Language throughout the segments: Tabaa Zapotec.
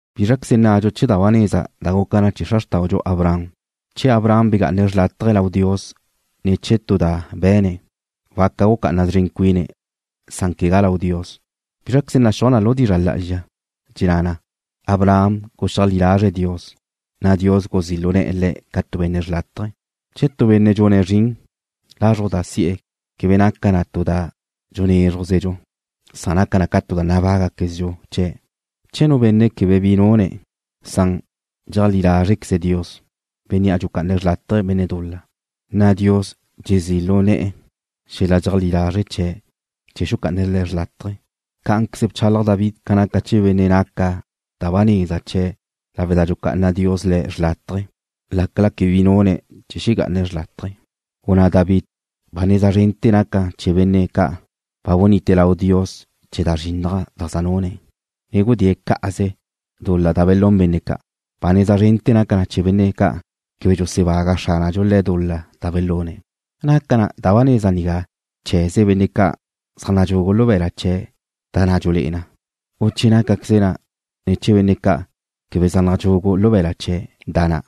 ¿Bízraqueze nnadxu chee̱ da ba neza da guca na chee̱ xra xrtáudxu Abraham? Che Abraham bega'ane̱' xrlátaje lau Dios ne̱ chee̱ tu da be̱ne̱', waca gucá'ana szren cuine̱' san quegá lau Dios. ¿Bízraqueze naxúaj na lu dizra' lá'azxa? Dxenná na: Abraham guxeajlí lazre̱' Dios, na' Dios guzí' lu ne̱'e̱ le̱' ca tu benne' xrlátaje. Che nu benne' dxune̱' zrin, lazruj da si'e̱ quebe naca na tu da dxunézrujzedxu, san naca na tu da nabágaquezdxu chee̱'. Che nu benne' quebe bi nune̱', san dxeajlí lázreze̱' Dios, Bénnea' dxucá'ane̱' xrlátaje benne' dul-la, nacan lawe' da dxezí' lu na' Dios xel-la dxeajlí lazre' chee̱' chee̱ xuca'ane̱' le̱' xrlátaje. Cá'anqueze bchalaj David ca naca chee̱ benne' naca da ba neza chee̱' lawe' da dxucá'ana Dios le̱' xrlátaje lácala quebe bi nune̱' chee̱ xegá'ane̱' xrlátaje. Gunná David: Ba neza zrente̱ naca na chee̱ benne' ca' ba bunite lau Dios chee̱' da zrinnaj da zaj nune̱', ne gudée̱' cá'aze dul-la da belún benne' ca'. Ba neza zrente̱ naca na chee̱ benne' ca' quebe dxusebaga Xránadxu le̱' dul-la da belune̱'. ¿Naca ba neza nigá chee̱ze benne' ca' zaj nadxugu lu be̱la' chee̱' da na' dxulé'e na, u che nácaqueze na chee̱ benne' ca' quebe zaj nadxugu lu be̱la' chee̱' da na'?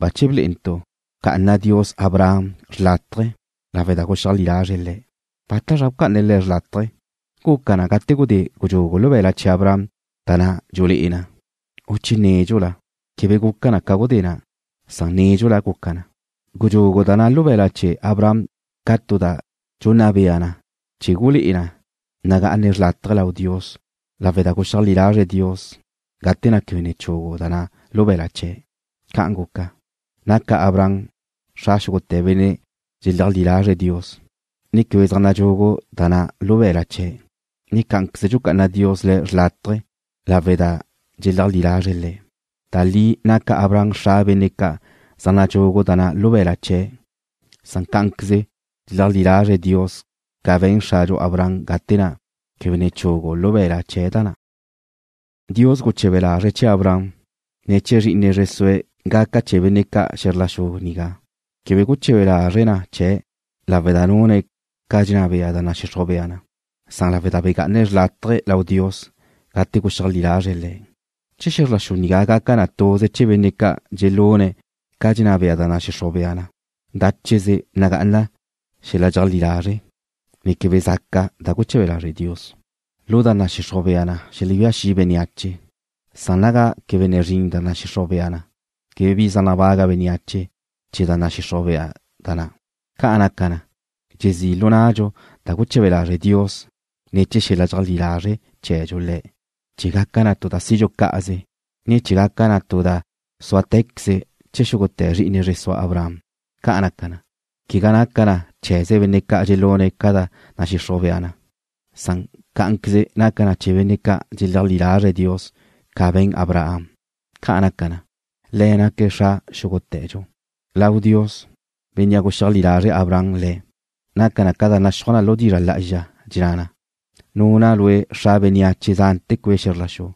Bache blé'entu' bca'ana Dios Abraham xrlátaje lawe' da guxeajlí lazre̱' Le̱'. ¿Bátazra bca'ane̱' le̱' xrlátaje? ¿Guca na ca gudé gudxugu lu be̱la' chee̱ Abraham da na' dxulé'e na, u che nédxula? Quebe guca na ca gudé na', san nédxula guca na. Gudxugu da na' lu be̱la' chee̱ Abraham ca tu da dxunna bea na chee̱ gulé'e na nagá'ane̱' xrlátaje lau Dios lawe' da guxeajlí lazre̱' Dios gate na' quebe ne chugu da na' lu be̱la' chee̱'. Ca'an guca, naca Abraham xra xúgute̱ benne' dxeleajlí lazre̱' Dios, ne quebe zaj nadxugu da na' lu be̱la' chee̱'. Cá'anqueze dxucá'ana Dios le̱' xrlátaje lawe' da dxeleajlí lazre̱' Le̱'. Da li naca Abraham xra benne' ca' zaj nadxugu da na' lu be̱la' chee̱', na' cá'anqueze dxeleajlí lazre̱' Dios ca be̱n xradxu Abraham gate na' quebe ne chugu lu be̱la' chee̱' da na'. Dios guche̱be lazre̱' chee̱ Abraham, ne chee̱ zri'ine zre sue̱' gaca chee̱ benne' ca' xe̱zr la xu nigá. Quebe guche̱be lazre̱' na chee̱' lawe' da nune̱' ca dxenná bea da nadxixruj bea na, san lawe' da bega'ane̱' xrlátaje lau Dios gate guxeajlí lazre̱' Le̱'. Che xe̱zr la xu nigá gaca na tuze chee̱ benne' ca' dxelune̱' ca da dxenná bea da nadxixruj bea na, dácheze nagá'ana xel-la dxeajlí lazre', ne québedxa zaca da guche̱be lazre' Dios. Lu da nadxixruj bea na xelebía xi' bénneache, san naga quebe ne zrin da nadxixruj bea na, quebe bi zaj nabaga bénneache chee̱ da nadxixruj bea na na'. Ca' naca na, dxezí' lu nnadxu da guche̱be lazre' Dios ne̱ chee̱ xel-la dxeajlí lazre' chee̱dxu Le̱', chee̱ gaca na tu da sidxu cá'aze, ne chee̱ gaca na tu da súatequeze chee̱ xúgute̱ zri'ine zre sua Abraham. Ca' naca na, quegá naca na chee̱ze benne' ca' dxelune̱' ca da nadxixruj bea na, san cá'anqueze naca na chee̱ benne' ca' dxeleajlí lazre̱' Dios ca be̱n Abraham. Ca' naca na, le̱' naque̱' xra xúgute̱dxu lau Dios, Bénnea' guxeajlí lazre' Abraham Le̱'. Naca na ca da naxúaj na lu dizra' lá'azxa, dxenná na: Nuna' lue' xra bénneache zánete̱ cue' xe̱zr la xu.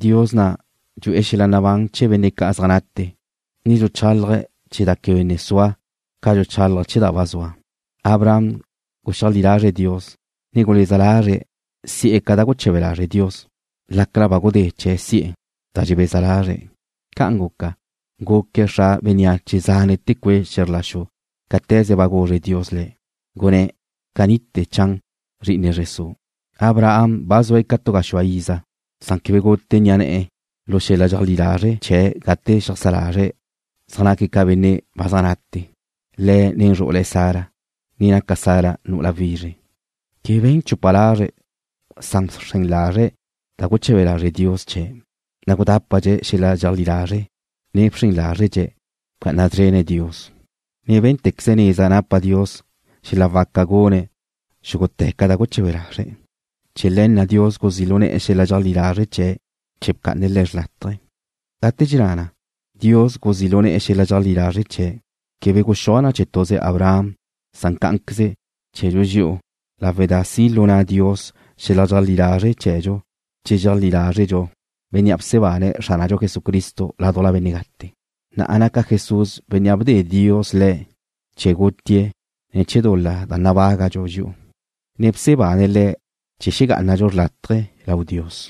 Dios na' dxu'e̱ xel-la nabán chee̱ benne' ca' zaj nate, ne dxuchálaje̱' chee̱ da quebe ne sua ca dxuchálaje̱' chee̱ da ba zua. Abraham guxeajlí lazre̱' Dios, ne guleza lazre̱' si'e̱ da guche̱be lazre' Dios, lácala ba gudé chee̱ si'e̱ da dxebeza lazre̱'. Ca'an guca, guque̱' xra bénneache zánete̱ cue' xe̱zr la xu cáte̱ze ba guzre Dios le̱', gunné̱': “Canite̱ chan zri'ine zre su'.” Abraham ba zue̱' ca tu gaxúa iza, san quebe gute ni'a ne̱'e̱ lu xel-la dxeajlí lazre' chee̱' gate xeajsá lazre̱' zaj naque̱' ca benne' ba zaj nate, le̱' ne zru'ule̱' Sara, ne naca Sara nu'ula wizre. Quebe be̱n chupa lazre̱', san bxren lazre̱' da guche̱be lazre' Dios chee̱', na' gudápadxe̱' xel-la dxeajlí lazre', ne bxren lázredxe̱'. Bca'ana szrene̱' Dios, ne bé̱ntequeze̱' neza napa Dios xel-la waca gune̱' xúgute̱ ca da guche̱be lazre̱'. Chee̱ le̱ na' Dios guzí' lu ne̱'e̱ xel-la dxeajlí lazre' chee̱' chee̱ bca'ane̱' le̱' xrlátaje. Gate dxenná na: “Dios guzí' lu ne̱'e̱ xel-la dxeajlí lazre' chee̱'”, quebe guxuaj na chee̱ tuze Abraham san cá'anqueze chee̱dxu dxi'u lawe' da si' lu na' Dios xel-la dxeajlí lazre' chee̱dxu che dxeajlí lázredxu Bénnea' bsebane̱' Xránadxu Jesucristo ládujla benne' gate, na' naca Jesús Bénnea' bde Dios Le̱' chee̱ gutie̱' ne̱ chee̱ dul-la da nabágadxu dxi'u, ne bsebane̱' Le̱' chee̱ xegá'anadxu xrlátaje lau Dios.